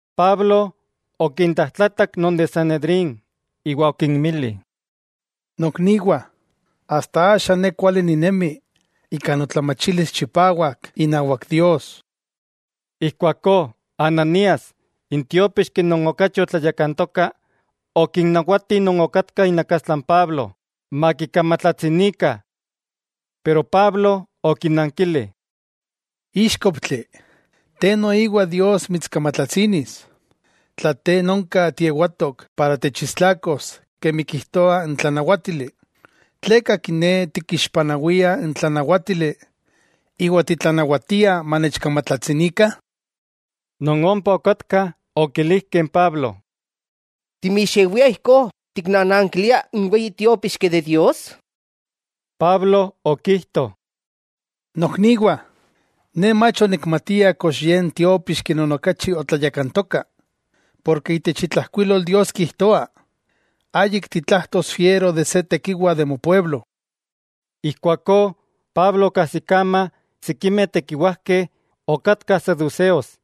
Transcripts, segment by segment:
Pablo okintlajtlatak non de Sanedrín iwa okinmili: —Nokniwah, asta axa ne kuali ninemi ika notlamachilis chipawak inawak Dios. Ijkuakó Ananías n tiópixki non okachi otlayakantoka, okinnawati non okatkah inakastla n Pablo, makikamatlatsinikah. Pero Pablo okinankili: —¡Íxkoptli, te noiwa Dios mitskamatlatsinis! Tla te nonka tiewatok para techistlakos kemi kijtoa n tlanawátili, ¿tleka kiné tikixpanawia n tlanawátili iwa titlanawatia manechkamatlatsinikah? Non ompa okatkah okilijkeh n Pablo: —¿Timixewia ijkó tiknanankilia n weyi tiópixki de Dios? Pablo okijto: —Nokniwah, ne mach onikmatia kox ye n tiópixki non okachi otlayakantoka; porke itech itlajkuilol Dios kijtoa: “Ayik fiero tiktenewas se tekiwa itech moaltepeu.” Ijkuakó Pablo okajsikama sikimeh tekiwajkeh okatkah saduseos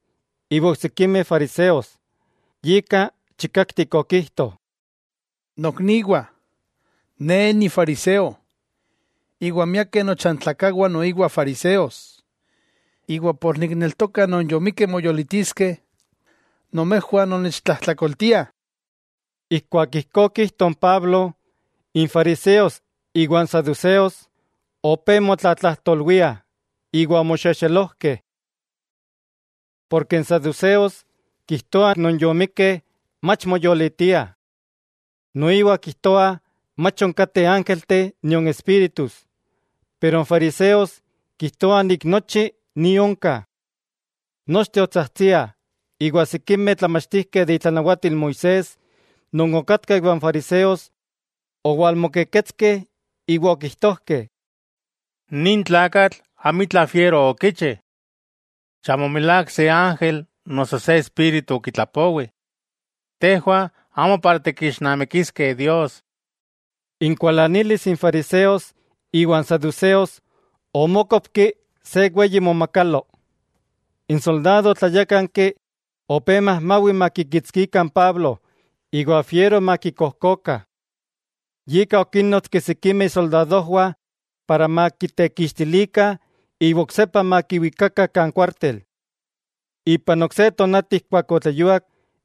iwa oksikimeh fariseos, yika chikaktik okijto: —Nokniwah, ne nifariseo, iwa miakeh nochantlakawah noiwa fariseos; iwa ken nikneltoka non yomikkeh moyolitiskeh, nomejwah nonnechtlajtlakoltiah. Ijkuak ijkó okijto n Pablo, n fariseos iwa n saduseos opé motlatlajtolwiah, iwa omoxexelojkeh. Porke n saduseos kijtoah non yomikkeh mach moyolitiah. Noiwa kijtoa mach onkateh ángelteh nion espíritus. Pero n fariseos kijtoah nochi ni onka. Nochteh otsajtsiah; iwa sikimeh tlamachtijkeh de itlanawatil Moisés, non okatkah iwa n fariseos, owalmokeketskeh iwa okijtojkeh: —Nin tlakatl amitla fiero okichi. Chamo milák se ángel noso se espíritu okitlapowi. Tejwah amo para tikixnamikiskeh Dios. Inkualanilis n fariseos iwa n saduseos omókopki se weyi momakalo. N soldado tlayákanki opé majmawi makikitskikah n Pablo iwa fiero makikojkokah. Yika okínnotski sikimeh isoldadojwah para makitekixtilikah iwa oksepa makiwikakah kan kuártel. Ipan ok se tonati ijkuak otleyuak,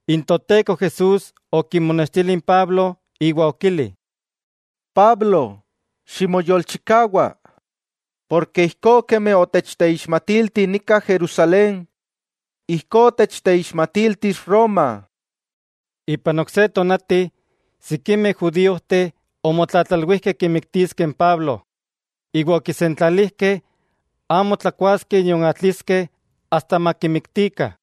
n Toteko Jesús okimonextili n Pablo iwa okili: —Pablo, ximoyolchikawa, porke ijkó kemi otechteixmatilti nika Jerusalén, ijkó techteixmatiltis Roma. Ipan ok se tonati, sikimeh judíojteh omotlatlalwijkeh kimiktiskeh n Pablo, iwa okisentlalijkeh amo tlakuaskeh nion atliskeh asta makimiktikah.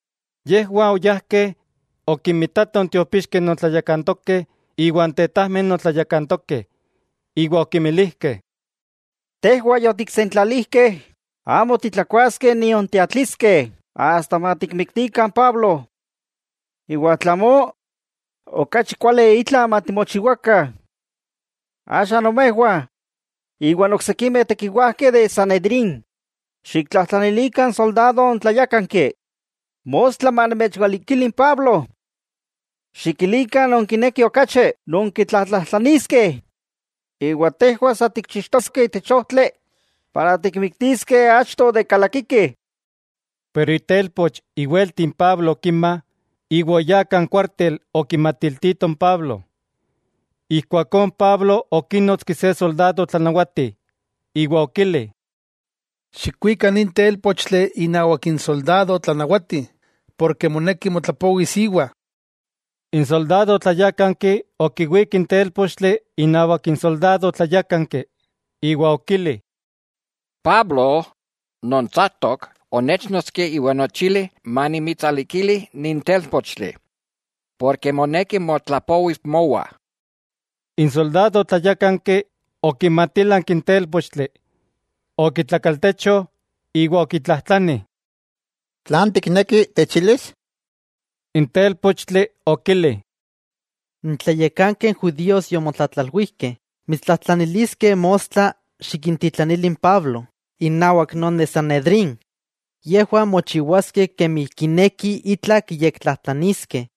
Yejwah oyajkeh okinmitatoh n tiopixkeh non tlayakantokeh iwa n tetajmeh non tlayakantokeh, iwa okinmilijkeh: —Tejwah yotiksentlalijkeh amo titlakuaskeh nion tiatliskeh asta matikmiktikah n Pablo. Iwa tla amó, okachi kuali itla matimochiwakah. Axa nomejwah, iwa n oksikimeh tekiwajkeh de n Sanedrín, xiktlajtlanilikah n soldado tlayákanki, mostla manomechwalikili n Pablo. Xikilikah nonkinekih okachi nonkitlatlajtlaniskeh, iwa tejwah sa tikchixtoskeh itech ojtli tikmiktiskeh keman ayamó onkalaki. Pero itelpoch iwelti n Pablo okima, iwa oyá kan kuártel okimatiltito n Pablo. Ijkuakó n Pablo okínotski se soldado tlanawati iwa okili: —Xikwika nin télpochtli inawak n soldado tlanawati, porke moneki motlapowis íwa. N soldado tlayákanki okiwík n télpochtli inawak n soldado tlayákanki, iwa okili: —Pablo non tsaktok, onéchnotski iwa onechili manimitsalikili nin télpochtli, porke moneki motlapowis mowa. N soldado okimatílanki n télpochtli, iwa okitlakaltecho iwa okitlajtlani: —¿Tlan tikneki techilis? N télpochtli okili: —N tlayakankeh judíos yomotlatlalwijkeh mitstlajtlaniliskeh mostla xikintitlanili n Pablo innawak non de Sanedrín, yejwah mochiwaskeh kemi kinekih itla kiyektlajtlaniskeh.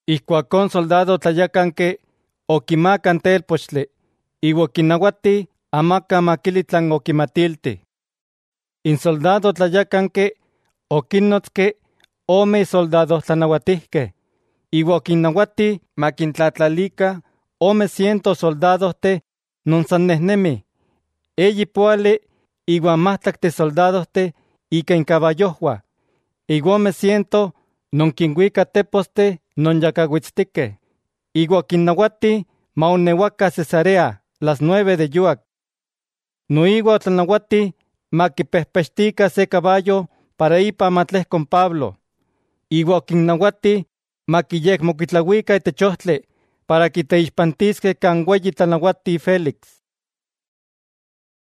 Ijkuakó n soldado tlayákanki, okimaaka n télpochtli iwa okinawati amaka makili tlan okimatilti. N soldado tlayákanki okínnotski ome isoldado tlanawatijkeh iwa okinnawati makintlatlalikah ome siento soldadojteh non san nejnemih, eyi póali iwa n májtlakteh soldadojteh ika inkabayojwah, iwa ome siento non kinwikah teposteh non yakawitstikeh, iwa okinnawati maonewakah Cesarea las nueve de yuak. Noiwa otlanawati makipejpechtikah se kabayo para ipa matlejko n Pablo, iwa okinnawati makiyekmokuitlawikah itech ojtli para kiteixpantiskeh kan n weyi tlanawati Félix.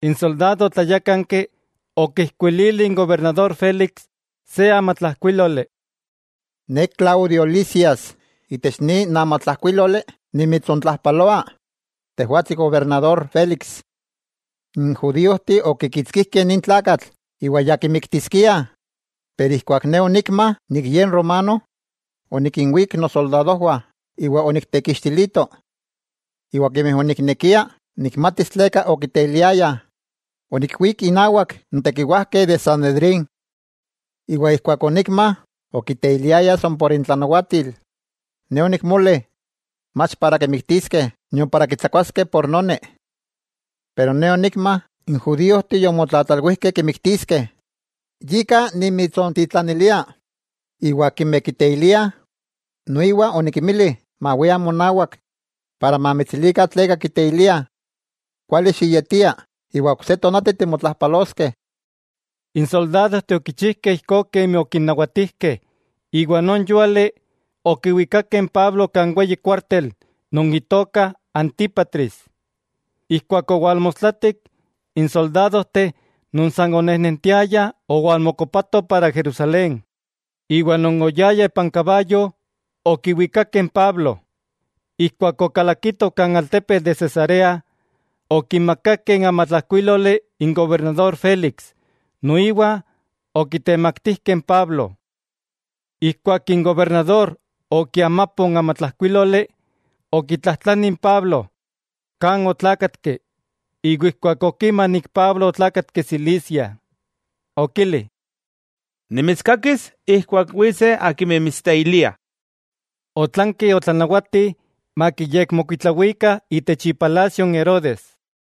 N soldado tlayákanki okijkuilili n gobernador Félix se amatlajkuíloli: “Ne Claudio Lisias itech nin amatlajkuíloli nimitsontlajpaloa tejwatsi gobernador Félix: N judíojteh okikitskijkeh nin tlakatl iwa ya kimiktiskiah, pero ijkuak ne onikma ye romano, onikinwík nosoldadojwah iwa oniktekixtilito. Iwa kemi oniknekia nikmatis tleka okiteiliayah, onikkuík innawak n tekiwajkeh de Sanedrín, iwa ijkuak onikma okiteiliayah san por intlanawatil, ne onikmoli mach para kimiktiskeh, nion para kitsakuaskeh ika noni. Pero ne onikma n judíojteh yomotlatlalwijkeh kimiktiskeh, yika nimitsontitlanilia, iwa akimeh kiteiliah noiwa onikinmili mawiah monawak iwa mamitsilikah tleka kiteiliah. Kuali xiyetia iwa ok se tonati timotlajpaloskeh.” N soldadojteh okichijkeh ijkó kemi okinnawatijkeh iwa non yúali okiwikakeh n Pablo kan weyi kuártel non itoka Antípatris. Ijkuak owalmostlatik, n soldadojteh non san onejnentiayah owalmokopatoh para Jerusalén, iwa non oyayah ipan kabayo okiwikakeh n Pablo. Ijkuak okalakitoh kan altepetl de Cesarea, okimakakeh n amatlajkuíloli n gobernador Félix noiwa okitemaktijkeh n Pablo. Ijkuak n gobernador okiamapo n amatlajkuíloli, okitlajtlani n Pablo kan otlákatki, iwa ijkuak okima Pablo otlákatki Cilicia, okili: —Nimitskakis ijkuak witseh akimeh mitsteiliah. Otlanki otlanawati makiyekmokuitlawikah itech ipalasio n Herodes.